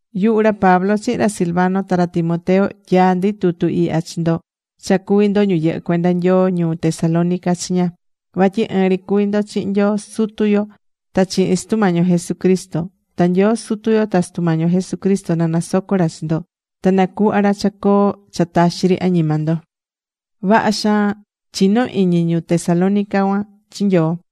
Yuhu ra Pablo chihin ra Silvano ta ra Timoteo, tyaá ndi tutu ihya chi ndo cha cuví ndo ñu yɨhɨ́ cuenda Nyoo ñuu Tesalónica chiña. Vatyi ɨɨn ri cuví ndo chihin Nyoo Sutu yo ta chihin Sutu Mañi yo Jesucristo. Ta Nyoo Sutu yo ta Sutu Mañi yo Jesucristo na nasoco ra chi ndo. Ta na cuhva ra cha coo cha taxi ri añima ndo.Vaha xaan chinó iñi ñu Tesalónica cuan chi Nyoo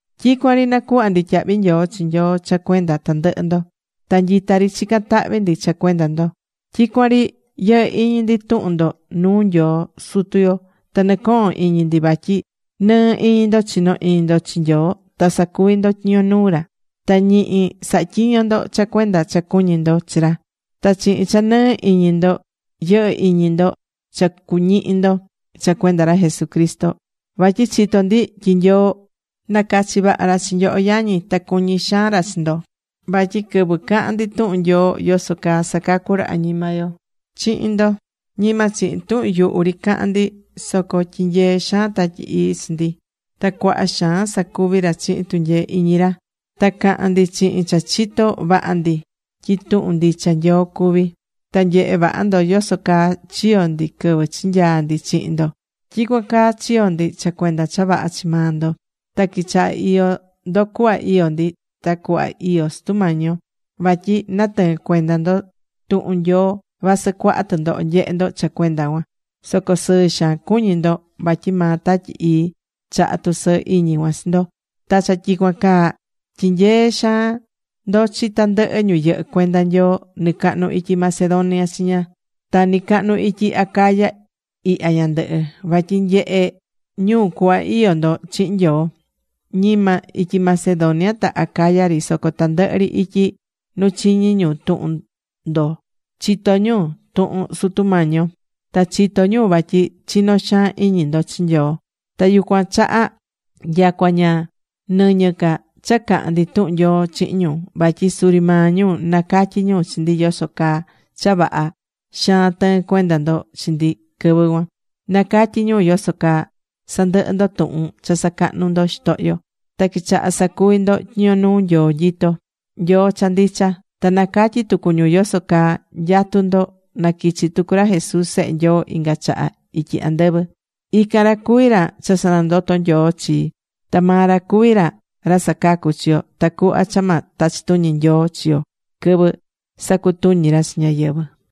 Tyicuan ri nacuhvá ndi tyahvi nyoo chi Nyoo cha cuenda tandɨhɨ ndo. Ta nyita ri chicán tahvi ndi cha cuenda ndo. Tyicuan ri yɨhɨ́ iñi ndi tuhun ndo nuu Nyoo Sutu yo ta nɨcohón iñi ndi vatyi nɨɨ iñi ndo chinó iñi ndo chi Nyoo ta sacuví ndo tyiño nuu ra. Ta ñihi sahá tyiño ndo cha cuenda cha cuñí ndo chi ra. Ta chihin cha nɨɨ iñi ndo yɨhɨ́ iñi ndo cha cuañihi ndo cha cuenda ra Jesucristo. Vatyi chitó ndi tyi Nyoo nacachi̱ vaha ra chi nyoho yañi. Ta cuñí xaan ra chi ndo. Vatyi quɨvɨ caha̱n ndi tuhun Nyoo yoso caa sacacú ra añima yo chihin ndo, ñima chihin tuhun yuhu ri cahan ndi, soco tyinyee xaan Tatyi Ii chi ndi, ta cuaha xaan sacuvi ra chihin tunyee iñi ra. Ta caha̱n ndi chihin cha chitó vaha ndi tyi tuhun ndicha Nyoo cuví. Ta nyehe̱ vaha ndo yoso caa chiyo̱ ndi quɨvɨ chinyaa̱ ndi chihin ndo. Tyicuan caa chiyo̱ ndi cha cuenda cha vaha chi maa ndo. Ta quichaha̱ iyó ndo cuhva iyó ndi, ta cuhva iyó Sutu Mañi yo. Vatyi natɨɨ̱n cuenda ndo tuhun Nyoo, vasɨ cuaha tɨndoho nyehe̱ ndo cha cuenda cuan. Soco sɨɨ xaan cuñí ndo vatyi maa Tatyi Ii chahá tusɨɨ iñi cuan chi ndo. Ta cha tyicuan caa, tyinyeé xaan ndo chi tandɨhɨ ñu yɨhɨ́ cuenda Nyoo nɨcahnu ityi Macedonia chiña ta nɨcahnu ityi Acaya ihya ñandɨhɨ, vatyi nyehé ñu cuhva iyó ndo chihin Nyoo. Ñima ityi Macedonia ta Acaya ri, soco tandɨhɨ ri ityi nu chiñí ñu tuhun ndo chitó ñu tuhun Sutu Mañi yo ta chitó ñu vatyi chinó xaan iñi ndo chi Nyoo. Ta yucuan chaha nyacua ña nɨñɨ ca cha cahan ndi tuhun Nyoo chihin ñu. Vatyi suri maa ñu nacatyí ñu chi ndi yoso caa cha vaha xaan tɨɨn cuenda ndo chi ndi quɨvɨ cuan. Nacatyí ñu yoso caa sandɨhɨ ndo tuhun cha sacahnu ndo xitohyo ta quichaha sacuvi ndo tyiño nuu Nyoo nyitó, Nyoo cha ndicha. Ta nacatyí tucu ñu yoso caa nyatú ndo naquichi tucu ra Jesús Sehe Nyoo inga chaha ityi andɨvɨ. Ican ra cuví ra cha sanandoto̱ Nyoo chii. Ta maa ra cuví ra ra sacacú chi yo tacuhva cha ma tachi tuñi Nyoo chi yo quɨvɨ sacutuñi ra chi ñáyɨvɨ.